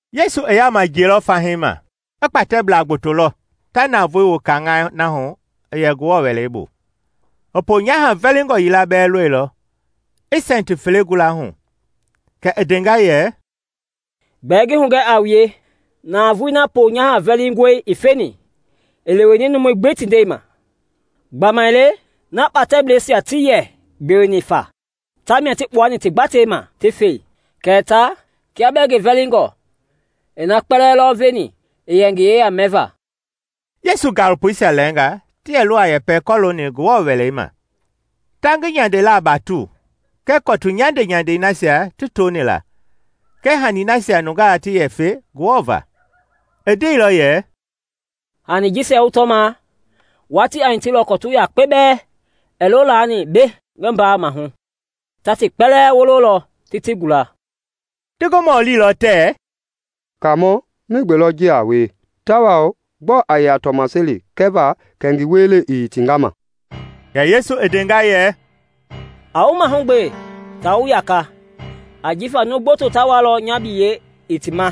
Yesu i yaama jiɛilɔ fahii ma, i kpatɛblaa gboto lɔ ta navoei wu kaŋaai na hu i yɛ Ngewɔ Wɛlei bu. I ponyaha vɛlingɔ yila bɛɛ lɔilɔ i sɛnti fele gula hu. Kɛ i ndenga yɛ, “Gbɛɛ ngi hugɛ a wue, navoei na ponyaha vɛlingɔi i feni i leweni numui gbi ti ndɛi ma. Gbamaile na kpatɛbleisia tii yɛ gbeweni fa tamia ti kpuani ti gbatei ma ti fe; kɛɛ ta, kia bɛɛ ngi vɛlingɔ i na kpɛlɛɛ lɔ veni i yɛ ngi yeya mɛva.” Yesu gaalopoisia lɛɛnga ti yɛlɔ a yɛpɛ kɔloongɔ Ngewɔ Wɛlei ma, ta ngi nyandelaa batu kɛɛ kɔtu nyandenyandei nasia ti toni la kɛɛ hani nasia nungaa ti yɛ fe Ngewɔ va. I ndeilɔ yɛ, “Hani jisia wu tɔma, watii a hitilɔ kɔtu yakpe bɛɛ ɛɛ lo laani mbei ngi mbaa mahu; ta ti kpɛlɛɛ wololɔ ti ti gula.” Ti ngi mɔlilɔ tɛɛ, “Kaamɔ, migbe lɔ ji a wie tawao gbɔɔ a yɛ a tɔmaseli kɛva kɛ ngi wielei i hitinga ma?” Kɛ Yesu i ndenga yɛ, “A wu mahugbe ta wu yaka; ajifa numu gboto ta walɔ nya biyei i ti ma,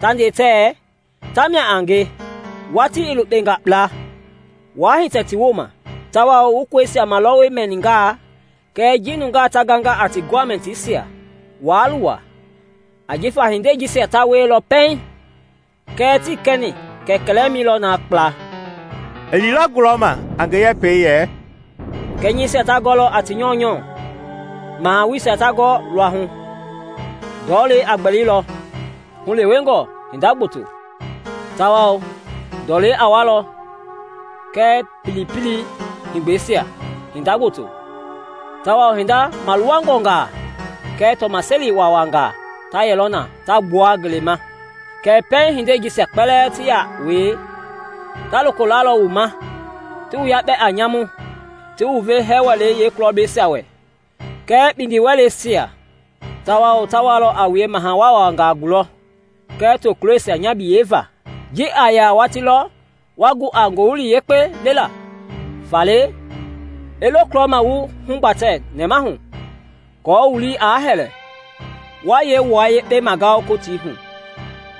ta nde tɛɛ ‘Tamia a nge! Watii i lukpenga kpla!’ Waa hitɛ ti wooma. Tawao wu kɔisia malɔwɔ mɛningaa kɛɛ ji nungaa ta ganga a ti gɔmɛtisia, waa luwa; ajifa hindei jisia ta wielɔ pɛiŋ, kɛɛ tii kɛni kɛ kɛlɛmɛi lɔ na kpla.” I liilɔ gulɔma a ngi yɛpɛi yɛ, “Kɛnyɛisia ta gɔlɔ a ti nyɔunyɔ, mahawuisia ta gɔ luahu; ndɔlei a gbɛlilɔ hulewengɔ hinda gboto, tawao ndɔlei a walɔ kɛɛ pilipili-heegbɛisia hinda gboto; tawao hinda maluwangɔngaa kɛɛ tɔmaseli wawangaa ta yɛlɔ na ta gbua ngelei ma. Kɛɛ pɛiŋ hindei jisia kpɛlɛɛ ti ya wie, ta loko lalɔ wu ma, ti wu yakpɛ a nyamu, ti wu ve hɛɛ wɛleisia yeekulɔblɛisia wɛ kɛɛ kpindiwɛleisia, tawao ta walɔ a wue maha wawangaa gulɔ kɛɛ tokuloisia nya biyei va. Ji a yɛ a watii lɔ wa gu a Ngowili Yekpei lela. Faale i lo kulɔma wu hugbatɛ nɛmahu aako wu lii aa hɛlɛ wa yee wua yekpe magao Kotii hu.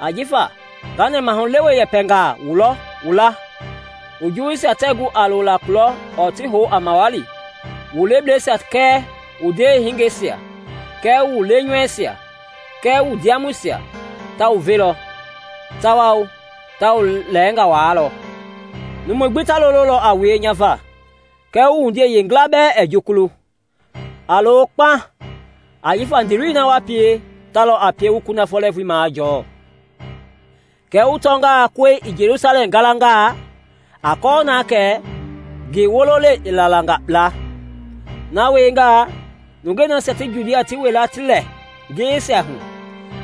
Ajifa nga nɛmahulewe yɛpɛngaa wulɔ wu la wu juwuisia tɛɛ gu a lola kulɔ ɔɔ ti hou a mawali. Wu lebleisia kɛɛ wu ndewehingeisia kɛɛ wu lenyamusia kɛɛ wu ndiamɔisia ta wu velɔ, tawao ta wu lɛɛnga waalɔ; Numui gbi ta lololɔ a wue nya va. Kɛɛ wu wundiei yeengila bɛɛ ɛɛ jukulu. A lo kpaŋ, ajifa ndiiloi na wa pie ta lɔ a pie wu kunafɔ lɛɛvui majɔɔ. “Kɛɛ wu tɔngaa kɔi i Jelusalɛm galanga, a kɔɔ na kɛ ngi wololei i lalanga kpla. Na wiengaa, nungei nasia ti Judia ti wila ti lɛ ngiyeisia hu,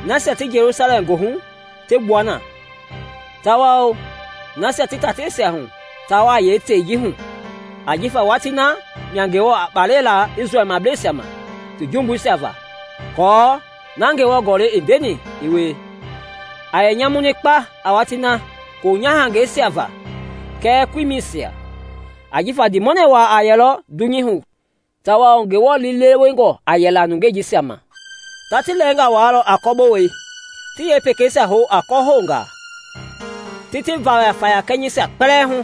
nasia ti Jelusalɛm goohu ti gbua na, tawao nasia ti tateisia hu taa wa yeetei ji hu; ajifa watii na mia Ngewɔ a kpalɛ la Isrɛlbleisia ma ti jumbuisia va aako na Ngewɔ Gɔlɛi i ndeni i wie. A yɛ nyamuni kpa a watii na koonyahangɛisia va kɛɛ koimɛisia! Ajifa ndiimɔnɛ wa a yɛlɔ dunyei hu tawao Ngewɔ liilewengɔ a yɛla nungei jisia ma; ta ti lɛɛnga waalɔ a kɔbowei, ti yeepekeisia hou a kɔhoungaa, ti ti vayafaya kɛnyɛisia kpɛlɛɛ hu;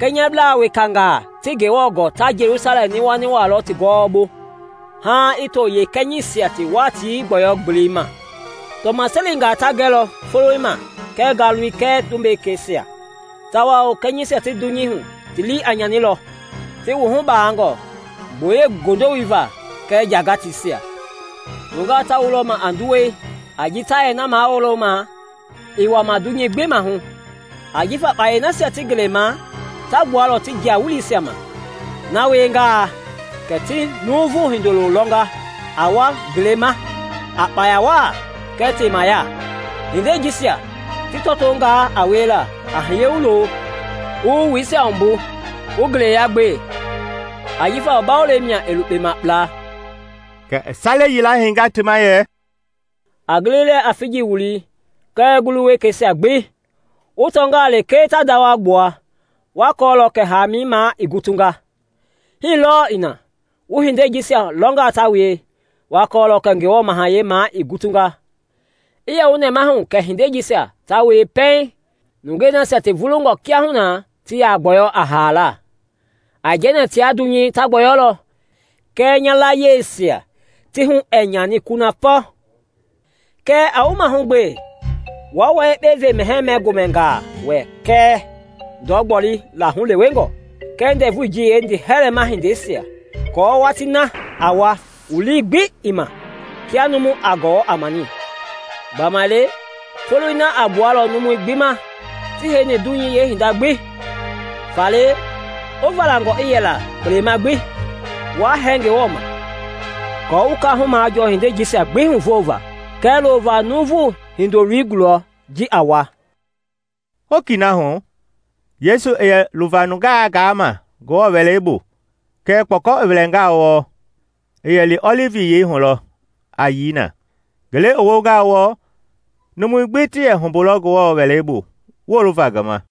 kɛnyɛblaa wekangaa tii Ngewɔ gɔɔ ta Jelusalɛm niwaniwalɔ ti gɔwɔbu haaŋ i to yeekɛnyɛisia ti watii gbɔyɔ-gbelei ma. “Tɔmaselingaa ta gɛlɔ foloi ma kɛɛ ngalui kɛɛ tumbekeisia, tawao kɛnyɛisia ti dunyei hu ti lii a nyanilɔ, ti wuhu bangɔ gboyei goondowoi va kɛɛ njagateisia, nungaa ta wulɔ ma a nduwɛi a ji ta yɛ na mawulo ma i wama dunyei gbi mahu, ajifa kpayei nasia ti ngelei ma ta gbualɔ ti jia-weleisia ma. Na wiengaa, kɛ ti Nuuvu Hindoloi lɔnga a wa ngelei ma a kpaya wa kɛɛ temaya. Hindei jisia ti tɔtongaa a wiela, a hiye wu lo, wu wu wuisia wumbu wu ngeleya gbe, ajifa wu Bawolei mia i lukpema kpla.” Kɛ i sale yila heinga ti ma yɛ, “A gili lɛɛ a figi wulii kɛɛ ngulu wekeisia gbi; wu tɔngaa lekee ta ndawa gbua, wa kɔɔlɔ kɛ hamɛi ma i gutunga. Hii lɔɔ i na, wu hindei jisia lɔnga ta wie, wa kɔɔlɔ kɛ Ngewɔ Mahayɛi ma i gutunga. “I yɛ wu nɛmahu kɛ hindei jisia ta wie pɛiŋ nungei nasia ti vulungɔ kiahuna ti ya gbɔyɔ a haala. Aijɛnɛ tia dunyei ta gbɔyɔlɔ kɛɛ nya layiesia ti hu ɛɛ nyani kunafɔ. “Kɛɛ a wu mahugbe waa wua yekpe ve mɛhɛɛ-mɛ-gomɛnga wɛ kɛɛ ndɔ gbolila hulewengɔ kɛɛ ndɛvui ji yeendiihɛlɛ mahindeisia aako watii na aa wa wu lii gbi ii ma kia numu a gɔwɔ a mani. Gbamaile foloi na a gbualɔ numui gbi ma ti heini dunyei yeehinda gbi. Faale wu valangɔ i yɛla kpelema gbi, wa hɛɛ Ngewɔ ma aako wu kaahu majɔɔ hindei jisia gbi huvova kɛɛ lova Nuuvu Hindoloi gulɔ ji a wa.” Hokii na hu Yesu i yɛ luva nungaa gaama Ngewɔ Wɛlei bu, kɛɛ kpɔkɔ i wɛlɛngaa wɔɔ, i yɛ li Ɔlivi Yiyei hu lɔ a yii na. Ngele i wongaa wɔɔ, numui gbi ti yɛ humbulɔ Ngewɔ Wɛlei bu wolova ngi ma.